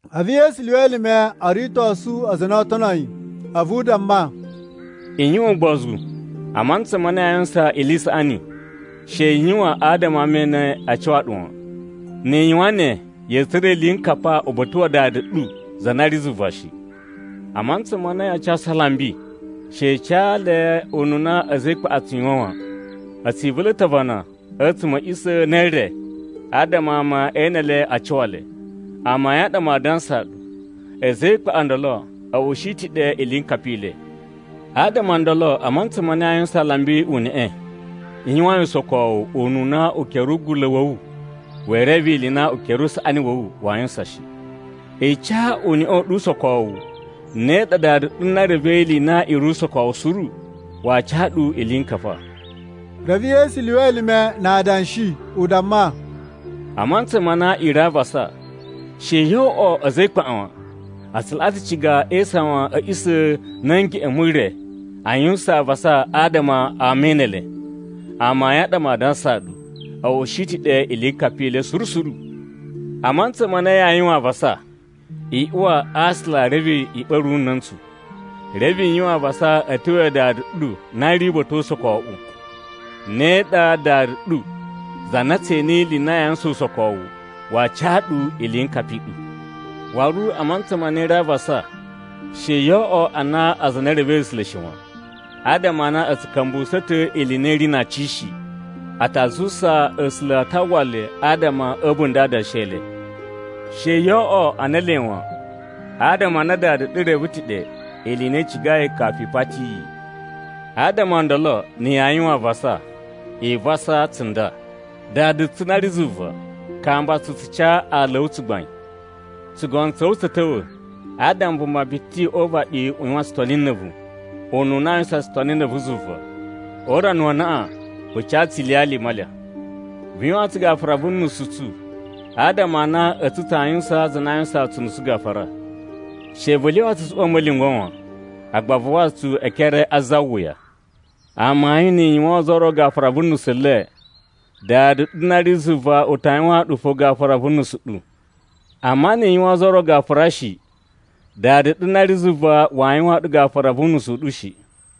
A̱vu Yesu lyuwa elime o ritosu aza a na oo tono yi a̱vu u damma, “I yuwan ugbozu! A mantsa ma na yaa yuwusan ili i saꞌani, she i yuwan adama ama e ene a cuwa ɗu wan. Ni i yuwan ne, ya̱a̱ tsura̱ iliyinkapa uba̱ta̱ wa Dada ɗu za na ri zuva shi. “A mantsa ma na yaa casu alambi, she i ca le ununa a̱za̱ e ikpaꞌa a tsu yuwan wan. A̱ tsi ivula̱ ta̱ avana a̱tsuma̱ a̱ a̱ꞌisa̱ ne e re adama ama e ene le a cuwa le. Amayun a ɗa maa dansaa ɗu, a̱za̱ e ikpaꞌa o ndolo a̱ ushi ta̱ ɗe iliyinkapa i le. Adama o ndolo a mantsa ma na yaa yuwusaan alambi uneꞌe, i yuwan yi usokowu ununa ukere ugula̱ wa̱ wu wee reve ili i na ukere usaꞌani wa̱ wu waa yuwusan shi. I ca uneꞌe u ɗu usokowu, ne ɗa Dada ɗu na revei ili i na i ri usokowu suru, waa ca ɗu iliyinkapa.” Reve Yesu lyuwa elime na adanshi u damma, “A mantsa ma na i ri a avasa, she yo oꞌwo ana a̱za̱ e ikpaꞌa wan! A tsu laꞌa ta̱ ciga e isawan a̱ a̱ꞌisa̱ na̱ a̱ ngeꞌen mu re a yuwusan avasa adama ama e ene le. Amayun a ɗa maa dansaa ɗu, a̱ ushi ta̱ ɗe iliyinkapa i le suru suru. A mantsa ma na yaa yuwan avasa, i uwa a aasula reve i ɓa̱ru una̱ntsu. Reve i yuwan avasa a̱ tyo ya Dada ɗu na ri uba̱ta̱ o usokowuꞌu. Ne ɗa Dada ɗu za na tse ene ili i na yaa yuwusan usokowu, waa ca ɗu iliyinkapa i ɗu. Waru a mantsa ma na i ri avasa, she yoo oꞌwo ana aza a na e revei A̱sula̱ shi wan. Adama a na a̱ tsu ka̱mbuwusa̱ ta̱ ili i na i ri na aci shi. A ta zuwusa A̱sula̱ a ta uwwa le adama a̱ a̱bunda̱ a adanshi e le. She yo oꞌwo ana ele wan. Adama a na Dada ɗu reve ta̱ ɗe ili i na i cigai kafu i pati yi. “Adama o ndolo, na̱ yaa yuwan avasa, i vasa tsunda: ‘Dada tsu na ri zuva, kamba tsu tsu ca aala a̱ wu tsugbain. Tsugono tsa̱ wu tsa̱ ta̱wa̱, adama vuma biti o uvaɗi u yuwan tsutoni na̱ a̱vu, Ununa aa yuwusan tsutoni na̱ a̱vu zuva. O urana wa anaꞌan vu ca tsu ilyalya i malya. Vu yuwaan tsu gafura vu nusu u tsu, adama a na a̱tsu tsaa yuwusaan aza a na aa yuwusan tsu unusu gafura. She vu lyawa tsu tsu uwa a̱ ma̱lyungwa̱ wan, agba vu wawa tsu e ekere a za wuya.’ “Amayun nni i yuwaan ozo o ro gafura vu nusu le, Dada ɗu na ri zuva u ta yuwaan ɗu fo gafura vu nusu ɗu. Amma ni i yuwaan ozo o ro gafura shi, Dada ɗu na ri zuva waa yuwaan ɗu gafura vu unusu u ɗu shi.”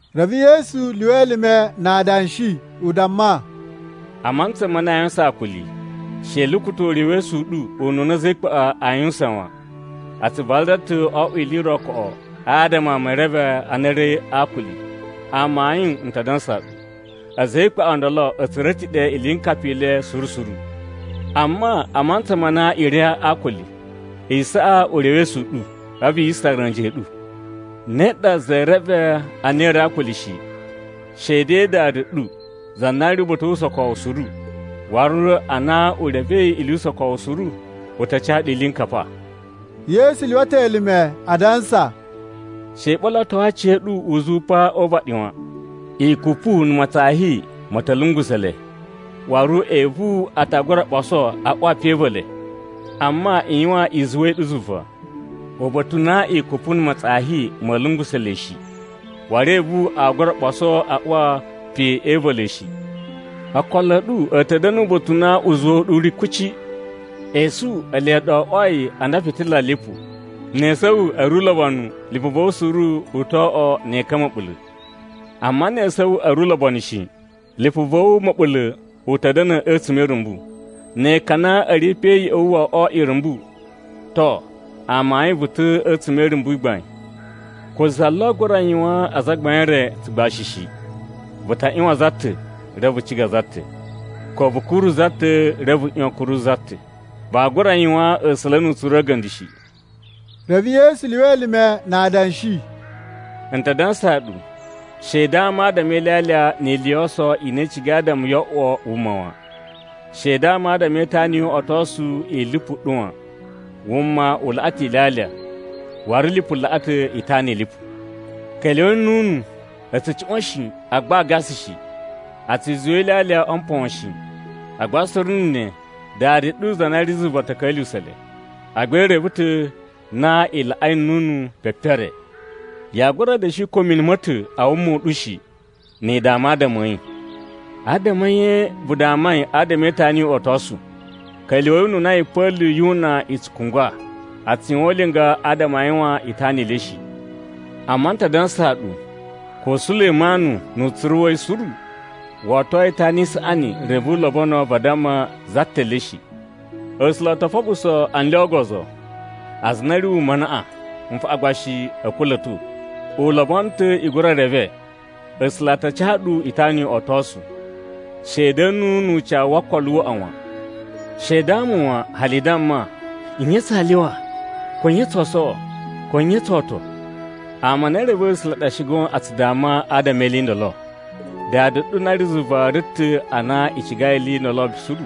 Reve Yesu lyuwa elime na adanshi u damma, “A mantsa ma na yaa yuwusan akuli, she i lukuta̱ urewesu u ɗu ununa a̱za̱ e ikpaꞌa a yuwusan wan. A tsu vadala ta̱ o oꞌwo ili i ro koꞌo adama ama e reve a na a̱ ri a akuli. Amayun n ta dansaa ɗu, a̱za̱ e ikpaꞌa o ndolo a̱ tsura̱ ta̱ ɗe iliyinkapa i le suru suru. Amma a mantsa ma na i ri a akuli, i saꞌa urewesu u ɗu a̱vu yi sara a̱nji a̱ ɗu. Ne ɗa za ee reve a na i ri a akuli shi, she de Dada ɗu, za na ri uba̱ta̱ o usokowu suru. Waru a na u revei ili yu usokowu suru, u ta ca ɗu iliyinkapa.” Yesu lyuwa ta̱ elime adansa, “She i ɓolotowo aciya̱ɗu uzuwa pa o uvaɗi wan! Ikupu na̱ matsafi ma̱ ta̱ lungusa̱ le, waru evu a ta gura ɓoso a uwa pe e iva̱ le. Amma, i yuwan izuwa i ɗu zuva, uba̱ta̱ u na ikupu na̱ matsafi ma̱a̱ lungusa̱ le shi, waru evu aa gura ɓoso a uwa pe e iva̱ le shi. Okolo a̱ ɗu a̱ ta̱ da̱na̱ uba̱ta̱ u na uzuwa u ɗu u ri kuci. “Esu ele ɗa o oꞌwoi ana fitila lipu. Ne esu a̱ wu a̱ ri ulobonu, lipu va̱ wu suru u to oꞌwo ne ekan ma̱ɓula̱. Amma ne esu a̱ wu a̱ ri ulobonu shi, lipu va̱ wu ma̱ɓula̱ u ta̱ da̱na̱ a̱tsuma̱ e irumbu. Ne ekan a na a̱ ri pe ya̱ꞌa̱ wu wo oꞌwo irumbu, to, amayun vu ta̱ a̱tsuma̱ e irumbu i gbain. “Ko za lo aa gura yuwaan azagbain e re tsugbashi shi. Vu ta ꞌyuwan za ta̱, reve vu ciga za ta̱. Ko vu kuru za ta̱, reve vu ꞌyuwan a̱ kuru za ta̱. Vaa gura yuwaan A̱sula̱ nu utsuru a̱ga̱nda̱ shi.” Reve Yesu lyuwa elime na adanshi, “N ta dansaa ɗu, she i dama adama e ilyalya ni ili yo oso i na i cigai adama yo oꞌwo wuma wan. She i dama adama e itana yu uꞌotosu i lipu i ɗu wan. Wuma u laꞌa ta̱ ilyalya, waru lipu laꞌa ta̱ itana i lipu. Ka̱lyuwa̱i nnunu! A̱ tsu cuꞌwa̱n shi, agba aa gasa shi. A tsu zuwa ilyalya o mpon shi. Agba suru na̱ ne Dada ɗu na ri zuva u ta̱ ka̱lyuwusa̱ le. Agba i reve ta̱ na i laꞌai nnunu pepere. Yaa gura da̱shi ko mini ma̱ ta̱ a wuma u ɗu shi ni i dama adama a̱ yi. “Adama a̱ nye vu damai adama e itana yu uꞌotosu? Ka̱lyuwa̱i ununa yipa̱lu yu una i tsu kungwa. A tsu yuwan ulinga adama a yuwan itana i le shi. Amma n ta dansaa ɗu, ko Sulemanu nu utsuru wa̱ yi suru, wo oto itana i saꞌani reve u lobono vadamma za ta̱ le shi. A̱sula̱ o to foɓuso anlya o ogozo, aza a na a̱ ri wuma anaꞌan, nfaꞌan gba shi a̱ kula̱to. U lobono ta̱ i gura reve A̱sula̱ a ta ca ɗu itana yu uꞌotosu. She i da̱na̱ nu ucawu wo okolo waꞌa wan! She i dama wan hali i damma, ‘Nye tsaa lyuwa?’ ko ‘Nye tsoo sowo?’ ko ‘Nye tsoo oto?’ Ama a na e revei A̱sula̱ ɗa shi goon a tsu dama adama e ili i ndolo. Dada ɗu na ri zuva reve ta̱ na i cigai ili i ndolo suru.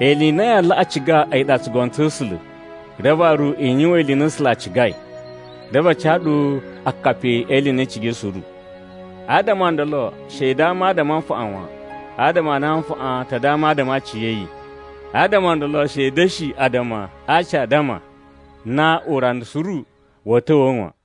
Ili i na yaa laꞌa ciga a̱yi ɗa tsugono tsa̱ A̱sula̱, reve waru i yuwan ili i na A̱sula̱ a cigai. Reve a ca ɗu akapi e ili i na i cigai suru. Adama o ndolo, she i dama adama a nfaꞌan wan, adama a na nfaꞌan ta dama adama a aciya̱yi. Adama o ndolo she i da̱shi addama a aci a addama na urana suru wa̱a̱ ta̱wa̱a̱ wan.”